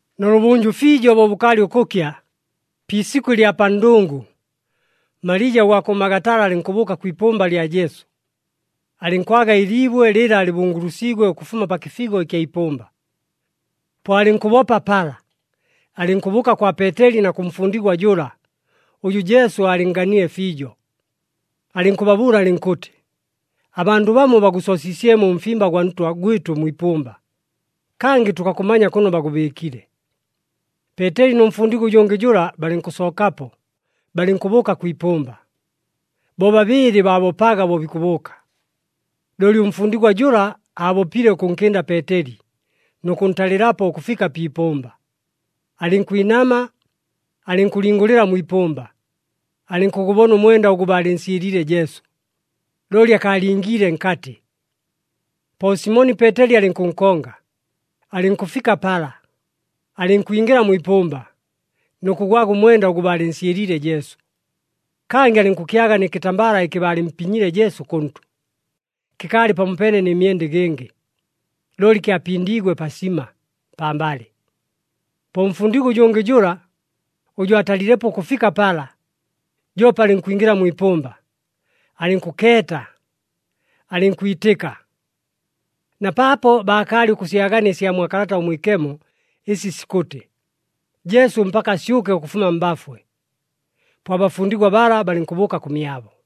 Nʉlʉbʉnjʉ fiijo bo bʉkaalɨ ʉkʉkya, pi isikʉ ɨlya pa ndʉngʉ, Malija ʉgwa kʉ Magatala alɨnkʉbʉʉka kwi ipʉmba lya Jesu. Alɨnkwaga ɨliibwe lɨla lɨbungulusiigwe ʉkʉfuma pa kɨfigo ɨkya ipʉmba. Po alɨnkʉbopa pala, alɨnkʉbʉʉka kwa Peeteli na kʉ mfundigwa jʉla, ʉjʉ Jesu aalɨnnganile fiijo. Alɨnkʉbabʉʉla alɨnkʉtɨ, “Abandʉ bamo bagʉsoosiisyemo ʉmfimba gwa Ntwa gwɨtʉ mwi ipʉmba, kangɨ tʉkakʉmanya kʉno bagʉbɨɨkile!” Peeteli nʉ mfundigwa ʉjʉngɨ jʉla, balɨnkʉsookapo, balɨnkʉbʉʉka kwi ipʉmba. Bobabɨɨlɨ baabopaga bo bikʉbʉʉka, looli ʉmfundigwa jʉla aabopile ʉkʉnkɨnda Peeteli, nʉ kʉntalɨlapo ʉkʉfika pi ipʉmba. Alɨnkwinama, alɨnkʉlingʉlɨla mwi ipʉmba, alɨnkʉgʉbona ʉmwenda ʉgʉ baalɨnsyɨliile Jesu, looli akaalingiile nkatɨ. Po Simoni Peeteli alɨnkʉnkonga, alɨnkʉfika pala, alɨnkwingɨla mwi ipʉmba nʉ kʉgwaga ʉmwenda ʉgʉ baalɨnsyɨliile Jesu. Kangɨ alɨnkʉkyaga nɨ kɨtambala ɨkɨ baalɨmpinyile Jesu kʉntʉ. Kɨkaalɨ pamopeene nɨ myenda ɨgɨngɨ, looli kyapindiigwe pasima, pambalɨ. Po ʉmfundigwa ʉjʉngɨ jʉla, ʉjʉ aatalilepo ʉkʉfika pala, joope alɨnkwingɨla mwi ipʉmba. Alɨnkʉkeeta, alɨnkwitɨka, na paapo baakaalɨ ʉkʉsyagania ɨsya mwa Kalata ʉMwikemo ɨsi sikʉtɨ, Jesu mpaka asyʉke ʉkʉfuma mbafwe. Po abafundigwa bala balɨnkʉbʉʉka kʉmyabo.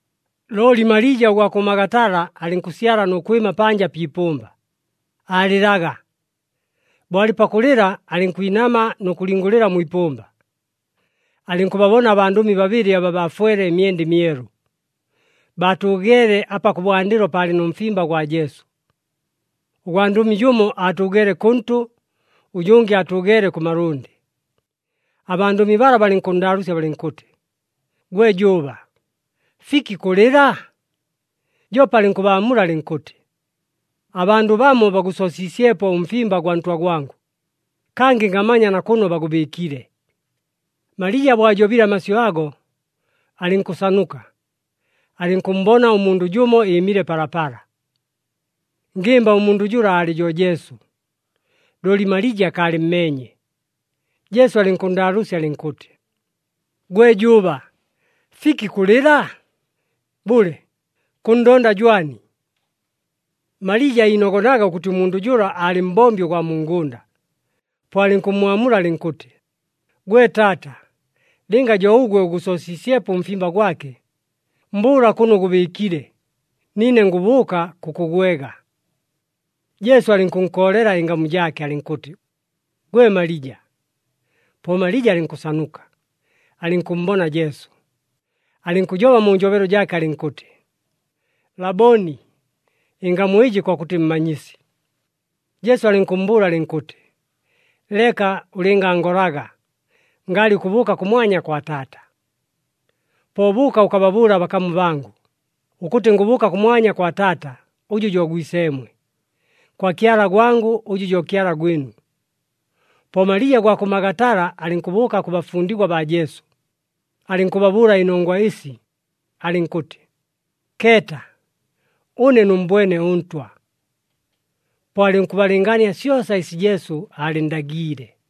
Looli Malija ʉgwa kʉ Magatala alɨnkʉsyala nʉ kwɨma panja pi ipʉmba, aalɨlaga. Bo alɨ pakʉlɨla, alɨnkwinama nʉ kʉlingʉlɨla mwi ipʉmba, alɨnkʉbabona abandʉmi babɨlɨ aba baafwele ɨmyenda ɨmyelu. Baatʉʉgeele apa kʉbwandɨlo paalɨ nʉ mfimba gwa Jesu. Ʉgwandʉmi jʉmo aatʉʉgeele kʉntʉ, ʉjʉngɨ aatʉʉgeele kʉ malʉndɨ. Abandʉmi bala balɨnkʉnndaalʉʉsya balɨnkʉtɨ, “Gwe jʉʉba, fiki kʉlɨla?” Joope alɨnkʉbaamula alɨnkʉtɨ, “Abandʉ bamo bagʉsoosiisyepo ʉmfimba gwa Ntwa gwangʉ, kangɨ ngamanya na kʉno bagʉbɨɨkile!” Malija bo ajobile amasyʉ ago, alɨnkʉsanuka, alɨnkʉmmbona ʉmundʉ jʉmo ɨɨmile palapala. Ngɨmba ʉmundʉ jʉla aalɨ jo Jesu, looli Malija akaalɨmmeenye. Jesu alɨnkʉnndaalʉʉsya alɨnkʉtɨ, “Gwe jʉʉba, fiki kʉlɨla? Bʉle, kʉnndonda jwani?” Malija iinogonaga ʉkʉtɨ ʉmundʉ jʉla aalɨ mbombi ʉgwa mu ngʉnda, po alɨnkʉmmwamula alɨnkʉtɨ, “Gwe taata, lɨnga jo ʉgwe ʉgʉsoosiisyepo ʉmfimba gwake, mbʉʉla kʉno ʉgʉbɨɨkile, niine ngʉbʉʉka kʉkʉgwega.” Jesu alɨnkʉnkoolela ɨngamu jaake alɨnkʉtɨ, “Gwe Malija!” Po Malija alɨnkʉsanuka, alɨnkʉmmbona Jesu, alɨnkʉjoba mu njobelo jaake alɨnkʉtɨ, “Laboni!” Ɨngamu ɨjɨ kokʉtɨ Mmanyisi. Jesu alɨnkʉmmbʉʉla alɨnkʉtɨ, “Leka ʉlɨngangolaga. Ngaalɨ ʉkʉbʉʉka kʉmwanya kwa Taata. Po bʉʉka ʉkababʉʉle abakamu bangʉ, ʉkʉtɨ ngʉbʉʉka kʉmwanya kwa Taata, ʉjʉ jo Gwiseemwe, kwa Kyala gwangʉ ʉjʉ jo Kyala gwɨnu.” Po Malija ʉgwa kʉ Magatala alɨnkʉbʉʉka kʉ bafundigwa baa Jesu, alɨnkʉbabʉʉla ɨnongwa ɨsi, alɨnkʉtɨ, “Keeta, ʉne nʉmmbwene ʉNtwa!” Po alɨnkʉbalɨngaania syosa ɨsi Jesu aalɨnndagiile.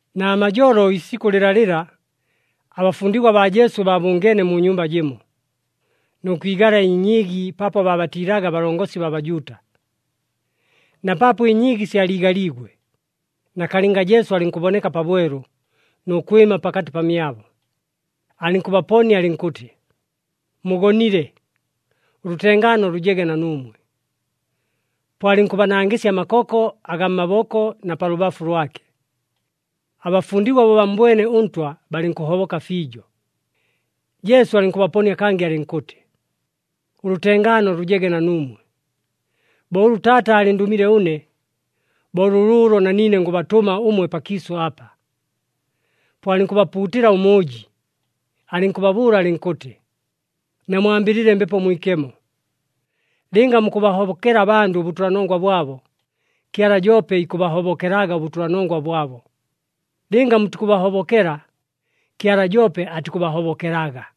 Namajolo ɨliisikʉ lɨlalɨla, abafundigwa baa Jesu baabʉngeene mu nyumba jɨmo, nʉ kwigala ɨnyiigi paapo baabatiilaga abalongosi baa Bajuuta. Na paapo ɨnyiigi syaliigaliigwe, nakalɨnga Jesu alɨnkʉboneka pabwelu, nʉ kwɨma pakatɨ pamyabo, alɨnkʉbaponia alɨnkʉtɨ, “Mugonile, ʉlʉtengaano lʉjege na nuumwe!” Po alɨnkʉbanangɨsya amakoko agaa mmaboko na pa lʉbafu lwake. Abafundigwa bo bammbwene ʉNtwa, balɨnkʉhoboka fiijo. Jesu alɨnkʉbaponia kangɨ alɨnkʉtɨ, “Ʉlʉtengaano lʉjege na nuumwe. Bo ʉlʉ Taata aalɨndʉmile ʉne, bo lʉlʉʉlo na niine ngʉbatʉma ʉmwe pakiisʉ apa.” Po alɨnkʉbapuutɨla ʉmʉʉji, alɨnkʉbabʉʉla alɨnkʉtɨ, “Namwambɨlɨle Mbepo Mwikemo. Lɨnga mukʉbahobokela abandʉ ʉbʉtʉlanongwa bwabo, Kyala joope ikʉbahobokelaga ʉbʉtʉlanongwa bwabo. Lɨnga mutikʉbahobokela, Kyala joope atikʉbahobokelaga.”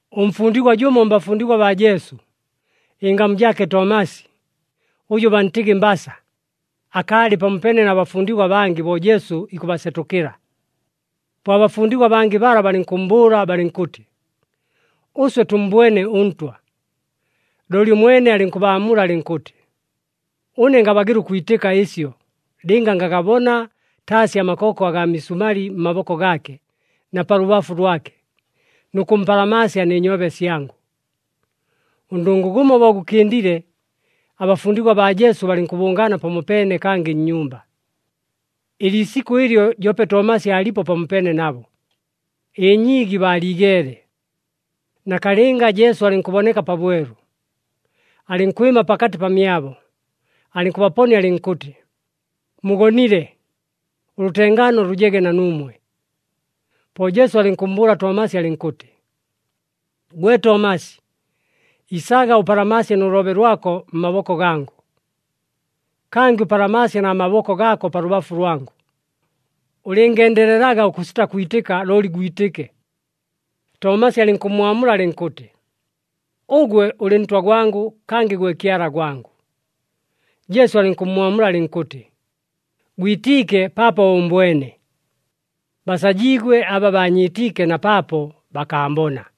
Ʉmfundigwa jʉmo mbafundigwa baa Jesu, ɨngamu jaake Tomasi, ʉjʉ bantɨgɨ Mbasa, akaalɨ pamopeene na bafundigwa abangɨ bo Jesu ikʉbasetʉkɨla. Po abafundigwa abangɨ bala balɨnkʉmmbʉʉla balɨnkʉtɨ, “Ʉswe tʉmmbwene ʉNtwa.” Looli ʉmwene alɨnkʉbaamula alɨnkʉtɨ, “Ʉne ngabagɨla ʉkwitɨka ɨsyo lɨnga ngagabona taasi amakoko agaa misumali mmaboko gaake na pa lʉbafu lwake, nʉ kʉmpalamaasya nɨ nyoobe syangʉ.” Ʉndʉngʉ gʉmo bo gʉkɨndile, abafundigwa baa Jesu balɨnkʉbʉngaana pamopeene kangɨ nnyumba. Ɨliisikʉ ɨlyo joope Tomasi aalipo pamopeene nabo. Ɨnyiigi baaliigeele, nakalɨnga, Jesu alɨnkʉboneka pabwelu, alɨnkwɨma pakatɨ pamyabo, alɨnkʉbaponia alɨnkʉtɨ, “Mugonile. Ʉlʉtengaano lʉjege na nuumwe!” Po Jesu alɨnkʉmmbʉʉla Tomasi alɨnkʉtɨ, “Gwe Tomasi, isaga ʉpalamaasye nʉ loobe lwako mmaboko gangʉ. Kangɨ ʉpalamaasye na maboko gaako pa lʉbafu lwangʉ. Ʉlɨngendelelaga ʉkʉsita kwitɨka, looli gwitɨke.” Tomasi alɨnkʉmmwamula alɨnkʉtɨ, “Ʉgwe ʉlɨ Ntwa gwangʉ! Kangɨ gwe Kyala gwangʉ!” Jesu alɨnkʉmmwamula alɨnkʉtɨ, “Gwitiike paapo ʉʉmbwene. Basajiigwe aba baanyiitiike na paapo bakaambona.”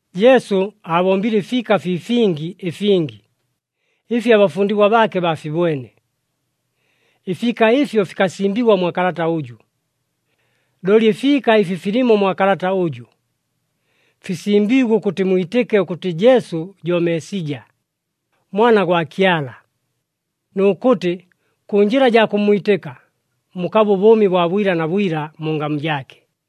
Jesu aabombile ɨfiika fii fingi ɨfingi, ɨfi abafundigwa baake baafibwene. Ɨfiika ɨfyo fikasimbigwa mwa kalata ʉjʉ. Looli ɨfiika ɨfi filimo mwa kalata ʉjʉ, fisimbiigwe ʉkʉtɨ mwitɨke ʉkʉtɨ Jesu jo Meesija, Mwana gwa Kyala, nʉ kʉtɨ kʉ njɨla jaa kʉmmwitɨka, mukabe ʉbʉʉmi bwa bwila na bwila mu ngamu jaake.